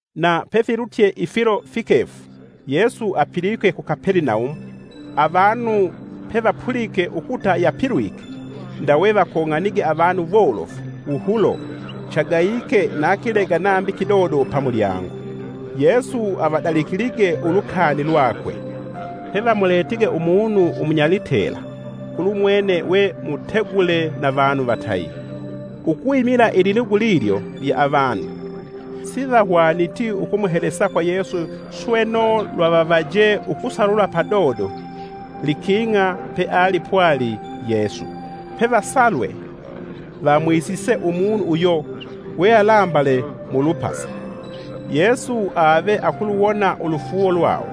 Na pefilutye ifilo fikefu, Yesu apilwike ku Kapelenaumu, avanu pevapulike ukuta yapilwike. Ndawe vakong'anige avanu wolofu wuhulo chagayike na kilega nambi kidodo pamulyango. Yesu avadalikilige ulukani lwakwe; pevamuletige umunu umunyalitela kulumwene we mutegule na vanu vatayi. Ukwimila ililugu lilyo lya avanu, sivahwaniti ukumuhelesa kwa Yesu sweno lwavavaje ukusalula padodo liking'a pe alipwali Yesu. Pevasalwe, vamwisise umunu uyo we alambale mulupasa. Yesu ave akuluwona ulufuuwo lwawo,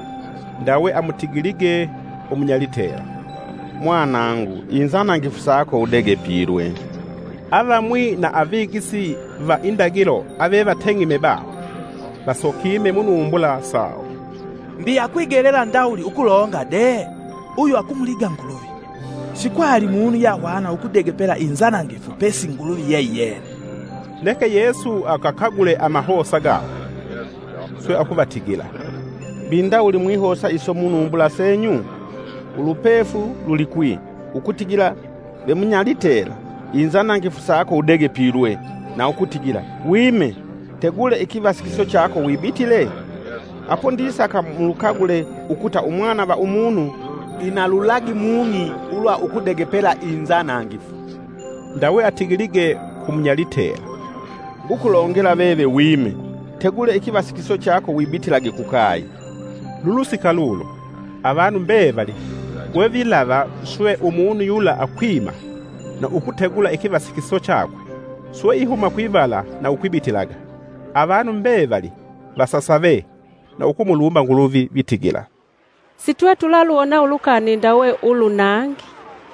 ndawe amutigilige umunyalitela, “Mwanangu inzanangifu sako udegepilwe.” Avamwi va avigisi va indagilo avevateng'eme baho, vasokime munumbula sawo, “Mbi akwigelela ndawuli ukulonga de? Uyu akumuliga Nguluvi! Sikwali munu yahwana ukudegepela inzanangifu pesi Nguluvi yeiyena.” Neke Yesu agakagule amahosa gawo, swe akuvatigila, “Mbi ndawuli mwihosa iso munumbula senyu? Ulupefu lulikwi ukutigila vemunyalitela, ‘Inzanangifu sako udegepilwe’, na ukutigila, ‘Wime! tegule ikivasikiso chako wibitile?’ Apo ndisaka mulukagule ukuta Umwana va Umunu ina lulagi mung'i ulwa ukudegepela inzanangifu.” Ndawe atigilige kumunyalitela. “Ngukulongela veve wime, tegule ikivasikiso chako wibitilage kukaye!” Lulusika lulo, avanu mbevali wevilava swe umunu yula akwima na ukutegula ikivasikiso chakwe swe ihuma kwivala na ukwibitilaga; avanu mbevali vasasave na ukumulumba Nguluvi vitigila, “Sitwetulaluwona ulukani ndawe ulu nangi.”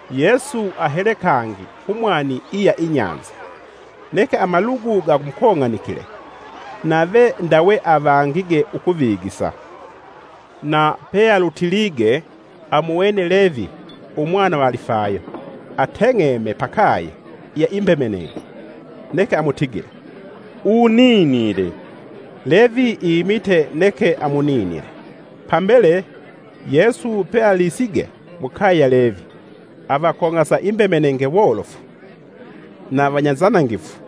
Yesu ahele kangi kumwani iya inyanza. Neke amalugu gamukong'anikile, nave ndawe avangige ukuvigisa. Na pealutilige, amuwene Levi umwana va Alifayo, ateng'eme pakaye iya imbemenenge. Neke amutigile, “Uninile!” Levi imite neke amuninile. Pambele, Yesu pealisige mukaye ya Levi, avakong'asa imbemenenge wolofu na vanyanzanangifu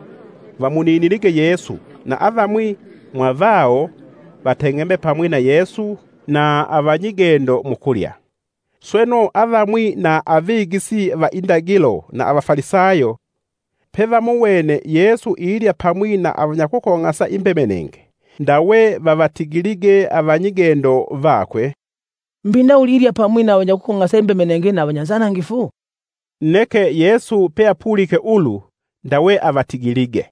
vamuninilige Yesu na avamwi mwa vawo vateng'eme pamwi na Yesu na avanyigendo mukulya. Sweno, avamwi va avigisi va indagilo na avafalisayo pevamuwene Yesu ilya pamwi na avanyakukong'asa imbemenenge ndawe vavatigilige, avanyigendo vakwe, “Mbi ndawuli ilya pamwi na avanyakukong'asa imbemenenge na avanyanzanangifu?” Neke Yesu peapulike ulu ndawe avatigilige,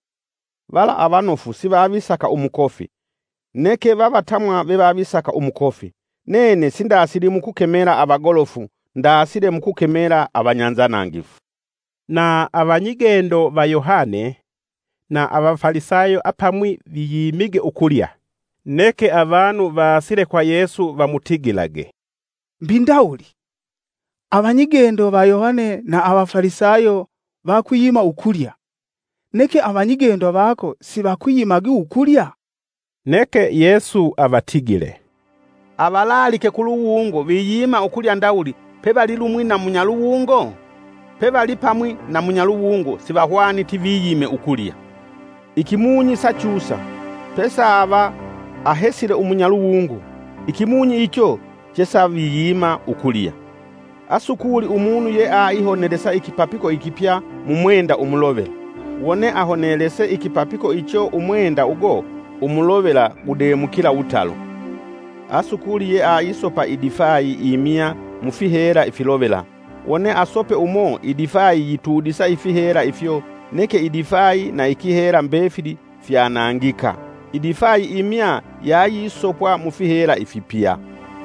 “Vala avanofu sivavisaka umukofi, neke vavatamwa vevavisaka umukofi, nene sindasili mukukemela avagolofu ndasile mukukemela avanyanzanangifu.” Na avanyigendo va Yohane na va Avafalisayo apamwi viyimige ukulya; neke avanu vaasile kwa Yesu vamutigilage, “Mbi ndawuli avanyigendo va Yohane na va Avafalisayo vakwiyima ukulya, neke avanyigendo vako sivakwiyimagi ukulya?” Neke Yesu avatigile, “Avalaalike kuluwungo viyima ukulya ndawuli pevalipamwi na munyaluwungo? Pe valipamwi na munyaluwungo sivahwaniti viyime ukulya. Ikimunyi sachusa, pesaava ahesile umunyaluwungo. Ikimunyi icho chesaviyima ukulya. “Asukuli umunu ye aihonelesa ikipapiko ikipya mumwenda umulovela. Wone ahonelese ikipapiko icho umwenda ugo umulovela gudemukila wutalo. Asukuli yeaisopa idifayi imya mufihela ifilovela wone asope umo idifayi yitudisa ifihela ifyo neke idifayi na ikihela mbefili fyanangika. Idifayi imya yayisopwa mufihela ifipya.”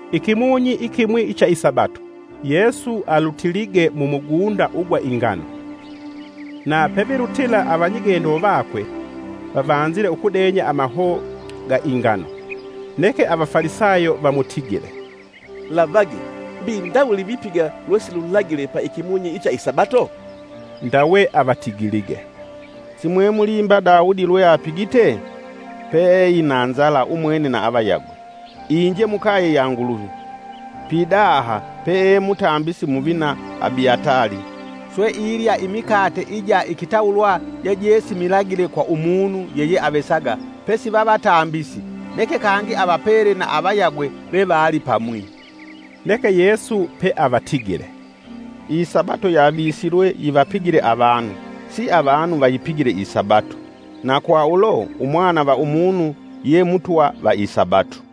Ikimunyi ikimwi icha isabato, Yesu alutilige mumugunda ugwa ingano. Na pevilutila avanyigendo vakwe vavanzile ukudenya amahoo ga ingano. Neke Avafalisayo vamutigile, “Lavage! Mbi ndawuli vipiga lwesilulagile pa ikimunyi icha isabato?” Ndawe avatigilige, “Si mwemulimba Daudi lwe apigite? Pe eina nzala umwene na avayagwe. Inje Mukaye ya Nguluvi, pidaha pee mutambisi muvina Abiatali swe ilya imikate ija ikitawulwa jejesimilagile kwa umunu yeyeavesaga pesi vavatambisi, neke kangi avapele na avayagwe vevevali pamwi.” Neke Yesu peavatigile, “Isabato yavisilwe yivapigile avanu. Siavanu vayipigile isabato! Na kwa ulo, Umwana va Umunu ye Mutwa, va isabato.”